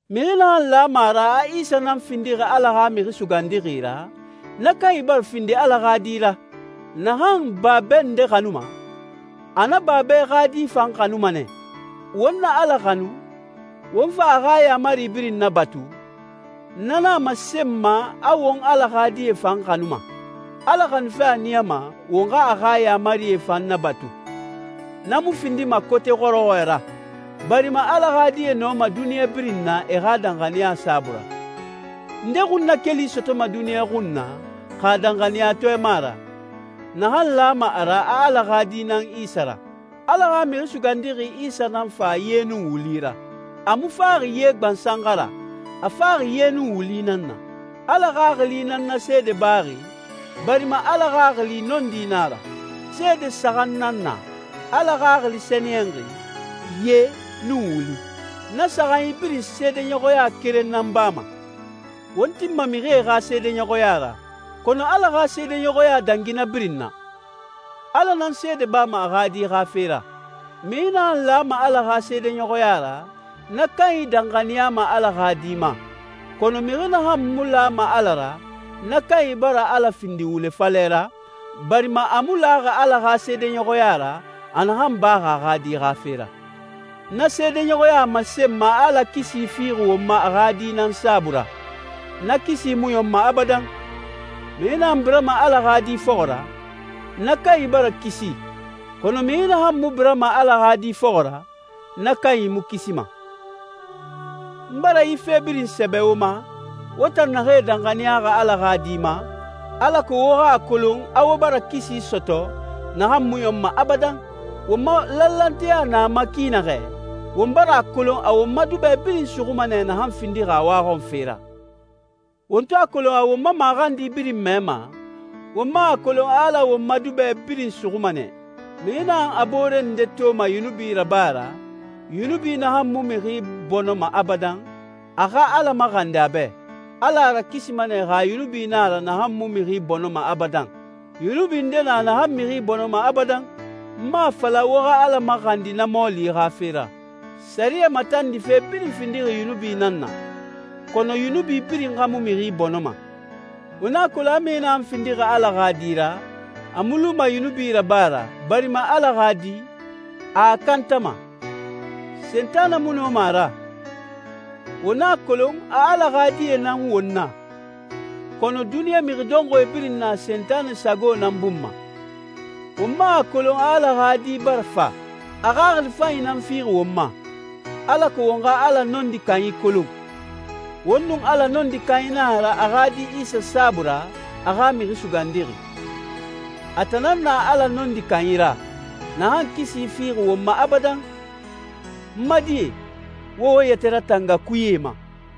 Mixi naxan lama a ra a Isa nan findixi Ala xa Mixi Sugandixi ra, na kanyi bara findi Ala xa di ra. Naxan babɛ nde xanuma, a na babɛ xa di fan xanuma nɛ. Won na Ala xanu, won fa a xa yaamari birin nabatu, na nan a masenma a won Ala xa die fan xanuma. Ala xanufe a niyama won xa a xa yaamarie fan nabatu. Na mu findima kote xɔrɔxɔɛ ra, barima Ala xa die nɔma duniɲa birin na e xa danxaniya saabui ra. Nde xunnakeli sɔtɔma duniɲa xun na, xa danxaniyatɔɛ mu a ra, naxan lama a ra a Ala xa Di nan Isa ra? Ala xa Mixi Sugandixi Isa nan fa ye nun wuli ra. A mu faxi ye gbansan xa ra, a faxi ye nun wuli nan na. Ala Xaxili nan na seede baxi, barima Ala Xaxili nɔndi nan a ra. Seede saxan nan na: Ala Xaxili Sɛniyɛnxi, ye, nun wuli. Na saxanyi birin seedeɲɔxɔya keren nan bama. Won tinma mixie xa seedeɲɔxɔya ra, kɔnɔ Ala xa seedeɲɔxɔya dangi na birin na. Ala nan seede bama a xa Di xa fe ra. Mixi naxan lama Ala xa seedeɲɔxɔya ra, na kanyi danxaniyama Ala xa Di ma, kɔnɔ mixi naxan mu lama Ala ra, na kanyi bara Ala findi wule falɛ ra, barima a mu laxi Ala xa seedeɲɔxɔya ra, a naxan baxi a xa Di xa fe ra. Na seedeɲɔxɔya a masenma a Ala kisi fixi won ma a xa Di nan saabui ra. Na kisi mu ɲɔnma abadan. Mixi naxan birama Ala xa Di fɔxɔ ra, na kanyi bara kisi, kɔnɔ mixi naxan mu birama Ala xa Di fɔxɔ ra, na kanyi mu kisima. N bara yi fe birin sɛbɛ wo ma, wo tan naxee danxaniyaxi Ala xa Di ma, alako wo xa a kolon a wo bara kisi sɔtɔ, naxan mu ɲɔnma abadan. Won ma lanlanteya na a ma ki naxɛ, won bara a kolon a won ma duba birin suxuma nɛ naxan findixi a waxɔnfe ra. Won to a kolon a won ma maxandi birin mɛma, won man a kolon a Ala won ma duba birin suxuma nɛ. Mixi naxan a boore nde toma yunubi raba ra, yunubi naxan mu mixi bɔnɔma abadan, a xa Ala maxandi a bɛ. Ala a rakisima nɛ xa yunubi na a ra naxan mu mixi bɔnɔma abadan. Yunubi nde na naxan mixi bɔnɔma abadan. N mu a fala wo xa Ala maxandi na mɔɔli xa fe ra. Sɛriyɛ matandife birin findixi yunubi nan na, kɔnɔ yunubi birin xa mu mixi bɔnɔma. Won a kolon mixi naxan findixi Ala xa di ra, a mu luma yunubi raba ra, barima Ala xa Di, a a kantama. Sentanɛ mu nɔma a ra. Won a kolon a Ala xa die nan won na, kɔnɔ duniɲa mixi dɔnxɔɛ birin na Sentanɛ sago nan bun ma. Won man a kolon a Ala xa Di bara fa. A xaxili fanyi nan fixi won ma, alako won xa Ala Nɔndi Kanyi kolon. Won nun Ala Nɔndi Kanyi nan a ra a xa Di Isa saabui ra, a xa Mixi Sugandixi. A tan nan na Ala Nɔndi Kanyi ra, naxan kisi fixi won ma abadan. N ma die, wo wo yɛtɛ ratanga kuyee ma.